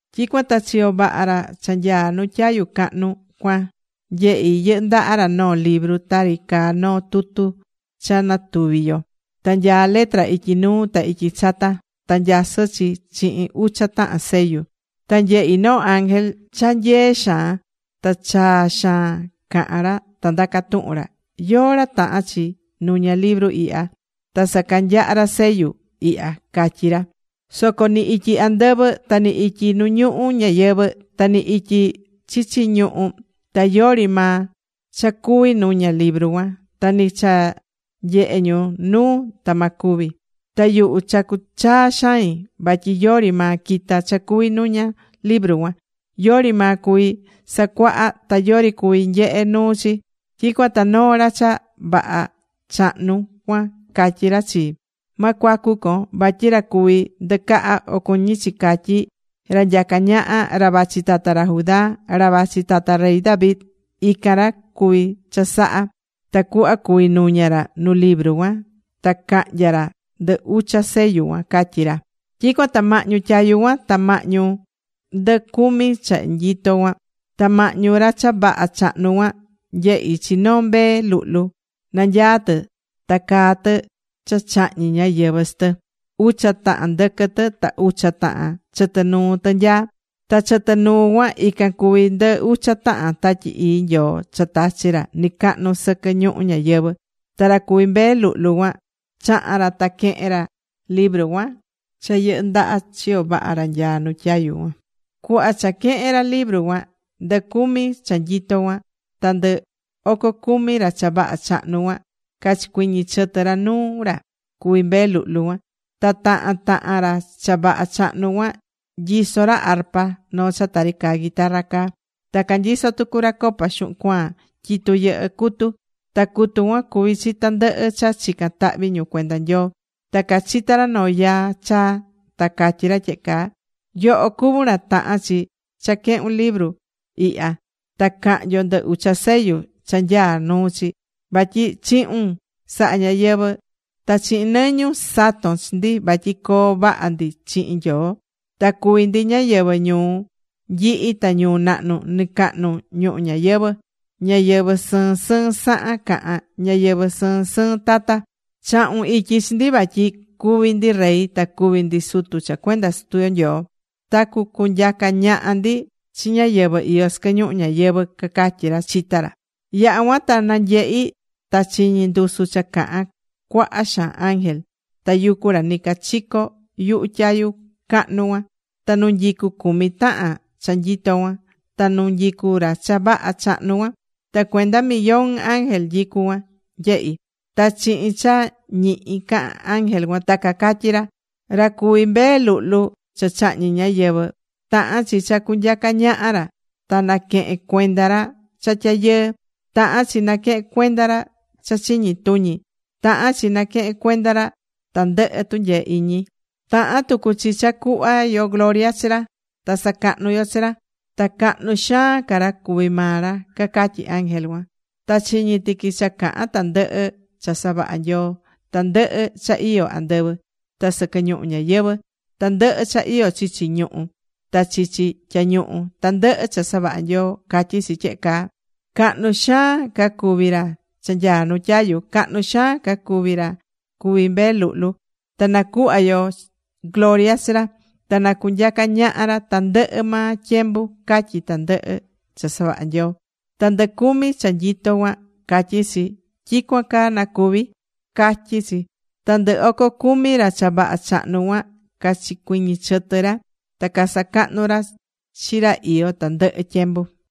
Tyicuan ta chiyo vaha ra cha nyaá nu tyayu cahnu cuan, nyehi̱ yɨhɨ́ ndaha ra noo libru tari caá noo tutu cha natuvi̱ yo. Ta nyaá letra ityi nuu ta ityi chata. Ta nyasɨ́ chi chihin ucha tahan sellu. Ta nyehi̱ noo ángel cha nyee xaan. Ta chaa xaan cahán ra ta ndacá tuhun ra: ―¿Yóó ra tahán chi nuña libru ihya ta sacanyaha ra sellu ihya? ―catyí ra. Soco ni ityi andɨvɨ ta ni ityi nu ñuhu ñayɨvɨ̱, ta ni ityi chichi ñuhú, ta yori maa cha cuví nuña libru cuan. Ta ni cha nyehe ñu nuu, ta ma cuvi. Ta yuhu chacu̱ chaa xain, vatyi yori maa quita̱ cha cuví nuña libru cuan. Yori maa cuví sacuaha, ta yori cuví nyehe nuu chi. Tyicuan ta noo ra cha vaha chahnu cuan catyí ra chii: ―Ma cuacu con. Vatyi ra cuví ndɨcaha o cuñí chi catyi, ra nyacá ñaha, ra vachi tata ra Judá, ra vachi tata rey David, ican ra cuvi̱ chasaha ra tacuhva cuví nuña ra nu libru cuan ta cahnya ra ndɨ ucha sellu cuan ―catyí ra. Tyicuan ta mahñu tyayu cuan ta mahñu ndɨ cumi cha nyitó cuan, ta mahñu ra cha vaha chahnu cuan, nyehi̱ chi noo Mbee Luhlu. Nanyaá tɨ ta caa tɨ cha chahñi̱ ñáyɨvɨ chi tɨ. Ucha tahan ndɨquɨ tɨ ta ucha tahan chɨtɨ nuu tɨ nyaá. Ta chɨtɨ nuu cuan ican cuví ndɨ ucha tahan Tatyi Ii Nyoo cha tachi̱ ra nicacahnu sɨquɨ ñuhu ñayɨvɨ̱. Ta ra cuví Mbee Luhlu cuan chaha̱n ra ta quehe̱n ra libru cuan cha yɨhɨ́ ndaha chiyo vaha ra nyaá nu tyayu cuan. Cuhva cha quehe̱n ra libru cuan, ndɨ cumi cha nyitó cuan ta ndɨ oco cumi ra cha vaha chahnu cuan cachicuɨñɨ̱ chɨtɨ ra nuu ra cuví Mbee Luhlu cuan. Ta tahan tahan ra cha vaha chahnu cuan nyisó ra arpa, noo cha tari caá guitarra caá. Ta canyisó tucu ra copa xuhun cuaan tyitu yɨhɨ́ cutu. Ta cutu cuan cuví chi tandɨhɨ cha chica̱n tahvi ñu cuenda Nyoo. Ta cachita̱ ra noo yaa chaa, ta catyí ra tyehe caa: Yoho cuví ra tahán chi cha quehun libru ihya, ta cahnyon ndɨ ucha sellu cha nyaá nu chi. Vatyi chihu̱n saha̱ ñáyɨvɨ. Ta chihin nɨñun sato̱n chi ndi vatyi coo vaha ndi chihin Nyoo. Ta cuví ndi ñáyɨvɨ ñuu nyihi ta ñuu nahnu nɨcacahnu ñuhu ñayɨvɨ, ñáyɨvɨ sɨɨn sɨɨn sahan cahán, ñáyɨvɨ sɨɨn sɨɨn tata. Chahu̱n ityi chi ndi vatyi cuví ndi rey ta cuví ndi sutu cha cuenda Sutu yo Nyoo. Ta cucunyaca ñaha ndi chi ñáyɨvɨ iyó sɨquɨ ñuhu ñayɨvɨ̱, cacatyí ra, chitá ra. Yaha̱ cuan ta nanyehi̱, ta chiñi̱ ndusu cha cahán cuaha xaan ángel, tayucú ra nicachico yuhu tyayu cahnu cuan, ta nu nyicú cumi tahan cha nyitó cuan, ta nu nyicú ra cha vaha chahnu cuan. Ta cuenda millón ángel nyicú cuan, nyehi̱. Ta chihin cha ñihi cahan ángel cuan, ta cacatyí ra: Ra cuví Mbee Luhlu cha chahñi̱ ñáyɨvɨ, tahán chi cha cunyaca ñaha ra, ta naquehen cuenda ra cha tyayɨɨ. Tahán chi naquehen cuenda ra cha chiñi tuñi. Tahán chi cha naquehen cuenda ra tandɨhɨ tunyee iñi. Tahán tucu chi cha cuhva yo gloria chi ra, ta sacahnu yo chi ra. Ta cahnu xaan ca ra cuví maa ra, cacatyí ángel cuan. Ta chiñi̱ tiqui cha cahán tandɨhɨ cha savaha̱ Nyoo, tandɨhɨ cha iyó andɨvɨ, ta sɨquɨ ñuhu ñayɨvɨ̱, tandɨhɨ cha iyó chichi ñuhú, ta chichi tyañuhu, tandɨhɨ cha savaha̱ Nyoo catyí chi tyehe caa: Cahnu xaan ca cuví ra cha nyaá nu tyayu. Cahnu xaan ca cuví ra cuví Mbee Luhlu. Ta nacuhva yo gloria chi ra. Ta na cunyaca ñaha ra tandɨhɨ maa tyembu, catyí tandɨhɨ cha savaha̱ Nyoo. Ta ndɨ cumi cha nyitó cuan catyí chi: ―¡Tyicuan caa na cuvi! ―catyí chi. Ta ndɨ oco cumi ra cha vaha chahnu cuan, cachicuiñi̱ chɨtɨ ra ta casacahnu̱ ra chi ra iyó tandɨhɨ tyembu.